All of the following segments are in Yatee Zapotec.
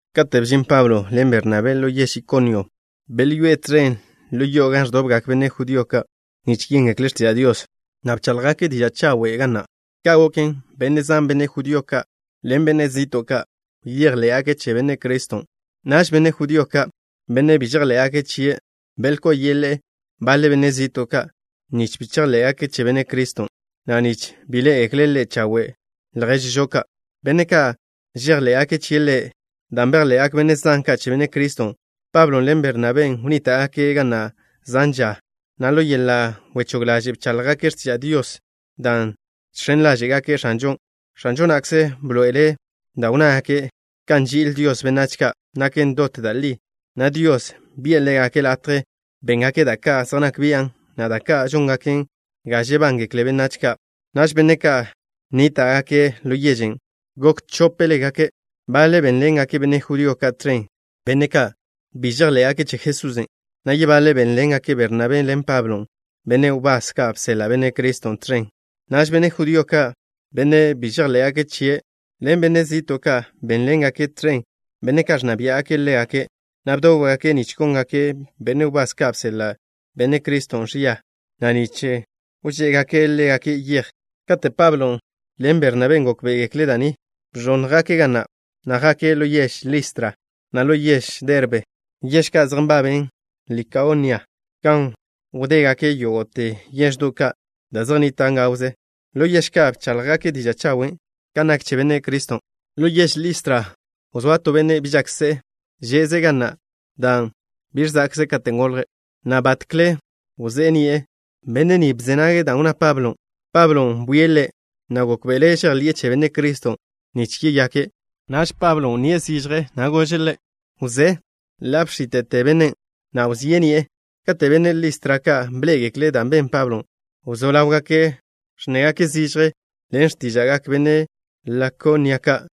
Kate' bžin Pablo ḻen Bernabé ḻo yež Ikonio, belyoé'e tẕen ḻo yo'o gan ẕdobgak benne' judío ka' nich yéngekle' x̱tiža' Dios, na' bcháḻjgake' diža' chawen' ga na'. Ka' goken, benne' zan, benne' judío ka' ḻen benne' zi'to' ka', bejḻé'gake' che Benne' Criston'. Naž benne' judío ka', benne' bi žejḻé'gake' chie', belkó'o yeḻe'e baḻe benne' zi'to' ka' nich bi chejḻé'gake' che Benne' Criston', na' nich bi ḻé'egekle' chawe' lježžo ka', benne' žejḻé'gake' chie' Ḻe'. Dan' bejḻe'gak benne' zan ka' che Benne' Criston', Pablon' ḻen Bernabén' wnníta'gake' ga na' zan ža, na' ḻo yeḻa' wechóg ḻaže' bcháḻjgake' x̱tiža' Dios, dan' žx̱en ḻáže'gake' X̱anžon'. X̱anžo na'kze bḻoe'ele' da' wnnágake' kan nži'il Dios benách ka' naken dot da' li, na' Dios bi'e ḻégake' latje béngake' da' ka' zej nak bian', na' da' ka' žóngaken ga žebángekle benách ka'. Naž benne' ka' nníta'gake' ḻo yežen' gok chópelegake'. Baḻe' bénḻengake' benne' judío ka' tẕen, benne' ka' bi žejḻé'gake' che Jesusen', na' yebaḻe' bénḻengake' Bernabén' ḻen Pablon', benne' wbás ka' bseḻa' Benne' Criston', tẕen. Naž benne' judío ka', benne' bi žejḻé'gake' chie' ḻen benne' zi'to' ka', bénḻengake' tẕen benne' ka' ẕnna biá'gake' ḻégake', na' bdóbgake' nich góngake' benne' wbás ka' bseḻa' Benne' Criston' ẕia, na' nich wžé'egake' ḻégake' yej. Kate' Pablon' ḻen Bernabén' gókbe'egekle' da' ni, bẕónnjgake' ga na', na' jake' ḻo yež Listra, na' ḻo yež Derbe, yež ka' zej nbaben Likaonia, gan wdégake' yógo'te yeždo' ka', da' zej nnitan' gawze. Ḻo yež ka' bcháḻjgake' diža' chawen' kan nak che Benne' Criston'. Ḻo yež Listra wzóa to benne' bi žak se'e. Že'ze' ga na' dan' bi ẕza'kze' katen' golje', na' batkle wzé'e ni'e. Benne' ni wzé nage' da' wnná Pablo. Pablon' bwie' ḻe', na' gókbe'ele' žejḻi'e che Benne' Criston' nich yeyake'. Naž wnné zižje Pablon', na' gože' ḻe': —Wzé. Ḻa' bx̱íte'te bennen', na' wzé'e ni'e. Kate' benne' Listra ka' bḻé'egekle' dan' ben Pablon', wzó ḻáwgake' ẕnnégake' zižje ḻen x̱tíža'gak benne' Likaonia ka',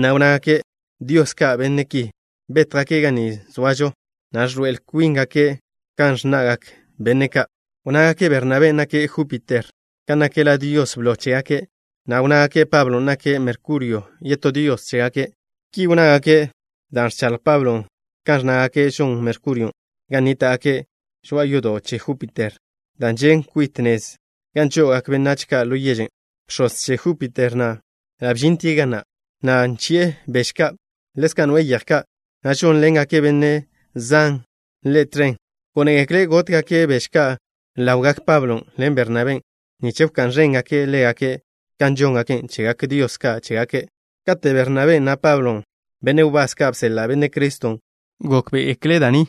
na' wnnágake': —¡Dios ka' benne' ki! Bétjgake' ga ni zoažo, na' ẕḻoe'el kwíngake' kan ẕnna'gak benne' ka'. Wnnágake' Bernabén' nake' Júpiter, kan nak la dios blo chégake', na' wnnágake' Pablon' nake' Merkurio, yetó dios chégake'. Ki wnnágake' dan' ẕchaḻj Pablon' kan ẕnnágake' žon Merkurion'. Gan nníta'gake' zoa yodo' che Júpiter, da' žen' kwit nez gan žo'ogak benách ka' ḻo yežen'. Bx̱oz che Júpiter na' ḻa' bžintie' ga na', na' nchi'e beže ka', na' ḻezka' noe'e yeje ka', na' žónḻengak benne' zan ḻe' tẕen. Gónegekle' gótgake' beže ka' ḻawgak Pablon' ḻen Bernabén' nich wká'n ẕéngake' ḻégake' kan žóngake' chegak dios ka' chégake'. Kate' Bernabén', na' Pablon', benne' wbás ka' bseḻa' Benne' Criston', gókbe'egekle' da' ni,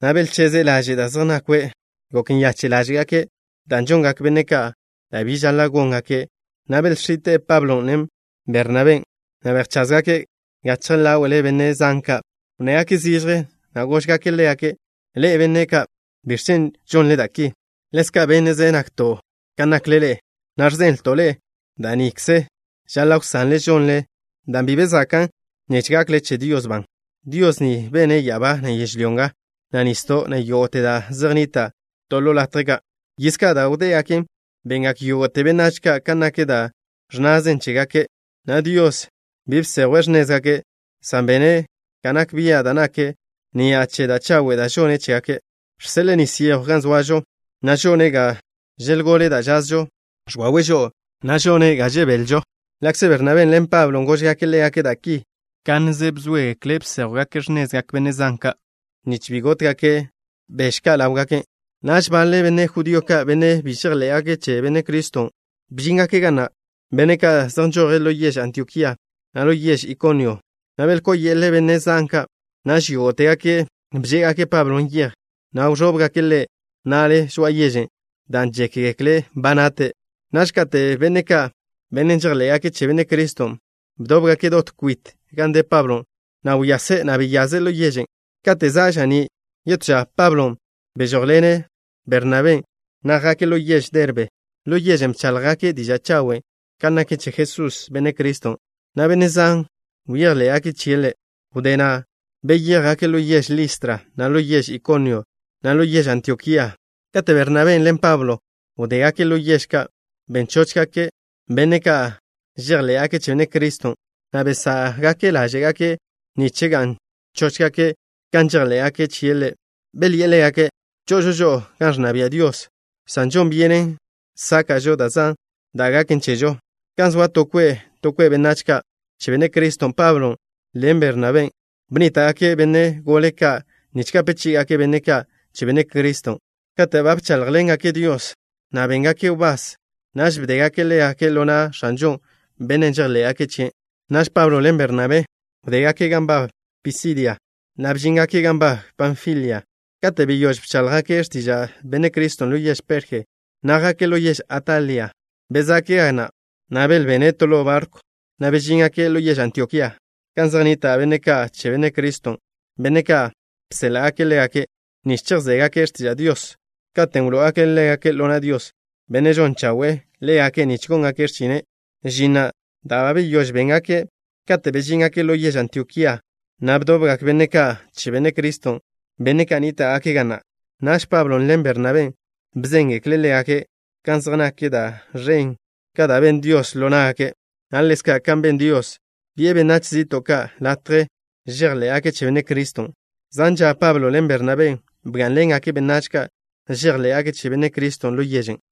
na' belcheze'e laže' da' zej nakwe'. Gok nyache' ḻáže'gake' dan' žongak benne' ka' da' bi žaḻa' góngake', na' belx̱ite' Pablon', na' Bernabén', na' bejcházgake' gachje ḻáwe'le benne' zan ka'. Wnnégake' zižje, na' gózgake' ḻégake': —Ḻe'e, benne' ka'. ¿Biẕ chen' žonle da' ki? Ḻezka' bénne'ze nakto' kan nakle ḻe'e, na' ẕzenlto' ḻe'e da' nikze žaḻa' wsanle žonle, dan' bi be zakan', nich gakle che Dios ban. Dios ni bene' ya'abá, na' yežlyó nga, na' nisdo', na' yógo'te da' zej nnitan' to to latje ka'. Yiz ka' da' wdégaken, bengak yógo'te benách ka' kan nak da' ẕnnazen chégake', na' Dios bi bsejwe' x̱nézgake', san bene' ga nak bia' da' nake', ni'a che da' chawe' da' žone' chégake'. Žseḻe'e nis yejw gan zoažo, na' žone' ga želgole da' žazžon. Ẕwawe' žo'o, na' žone' ga žebelžo. Ḻa'kze Bernabén' ḻen Pablon' góžgake' ḻégake' da' ki, kánneze bzóegekle' bséjwgake' x̱nezgak benne' zan ka', nich bi gótgake' beže ka' ḻáwgake'. Naž baḻe benne' judío ka', benne' bi žejḻé'gake' che Benne' Criston', bžíngake' ga na', benne' ka' zej nžoje' ḻo yež Antiokía, na' ḻo yež Ikonio, na' belkó'o yeḻe'e benne' zan ka'. Naž yógo'tegake' bžé'egake' Pablo yej, na' bẕóbgake' ḻe' na'le žoa'a yežen', dan' žékgekle' ba nate'. Naž kate' benne' ka', benne' žejḻé'gake' che Benne' Criston', bdóbgake' dot kwit gan de Pablon', na' wyase', na' beyaze' ḻo yežen'. Kate' za' ža'ní' yetó ža, Pablon' bežójḻene' Bernabén', na' jake' ḻo yež Derbe. Ḻo yežen' bcháḻjgake' diža' chawen' kan nak che Jesús, Benne' Criston', na' benne' zan bejḻé'gake' chie' Ḻe'. Wdé na' beyéjgake' ḻo yež Listra, na' ḻo yež Ikonio, na' ḻo yež Antiokía. Kate' Bernabén' ḻen Pablon' wdégake' ḻo yež ka', ben chóchgake' benne' ka' žejḻé'gake' che Benne' Criston', na' besá'gake' ḻáže'gake' nich ga'n chóchgake' kan žejḻé'gake' chie' Ḻe'. Belyi'e ḻégake': —Cho'ožo žo'o gan ẕnna bia' Dios, san žon byenen sáka'žo da' zan da' gaken chežo. Gan zoa to kwe' to kwe' benách ka' che Benne' Criston', Pablon' ḻen Benabén' bnníta'gake' benne' gole ka' nich gape chí'igake' benne' ka' che Benne' Criston'. Kate' ba bcháḻjḻengake' Dios, na' béngake' wbás, naž bdégake' ḻégake' ḻo na' X̱anžo, Bennen' žejḻé'gake' chie'. Naž Pablo ḻen Bernabé wdégake' gan nbab Pisidia, na' bžíngake' gan nbab Panfilia. Kate' beyóž bcháḻjgake' x̱tiža' Benne' Criston' ḻo yež Perje, na' jake' ḻo yež Atalia. Bezá'gake' ga na', na' belbene' to ḻo barkw, na' bežíngake' ḻo yež Antiokía, gan zej nnita' benne' ka' che Benne' Criston', benne' ka' bséḻa'gake' ḻégake' nich chejzégake' x̱tiža' Dios, katen' wló'ogake' ḻégake' ḻo na' Dios, Bennen' žon chawe'e ḻégake' nich góngake' x̱chine', žin na' da' ba beyóž béngake'. Katen' bežíngake' ḻo yež Antiokía, na' bdobgak benne' ka' che Benne' Criston', benne' ka' nníta'gake' ga na'. Naž Pablon' ḻen Bernabén' bzéngekle' ḻégake' kan zej nak da' ẕen ka' da' ben Dios ḻo ná'gake', na' ḻezka' kan ben Dios, bi'e benách zi'to' ka' latje žejḻé'gake' che Benne' Criston'. Zan ža Pablon' ḻen Bernabén' bgá'nḻengake' benách ka' žejḻé'gake' che Benne' Criston' ḻo yežen'.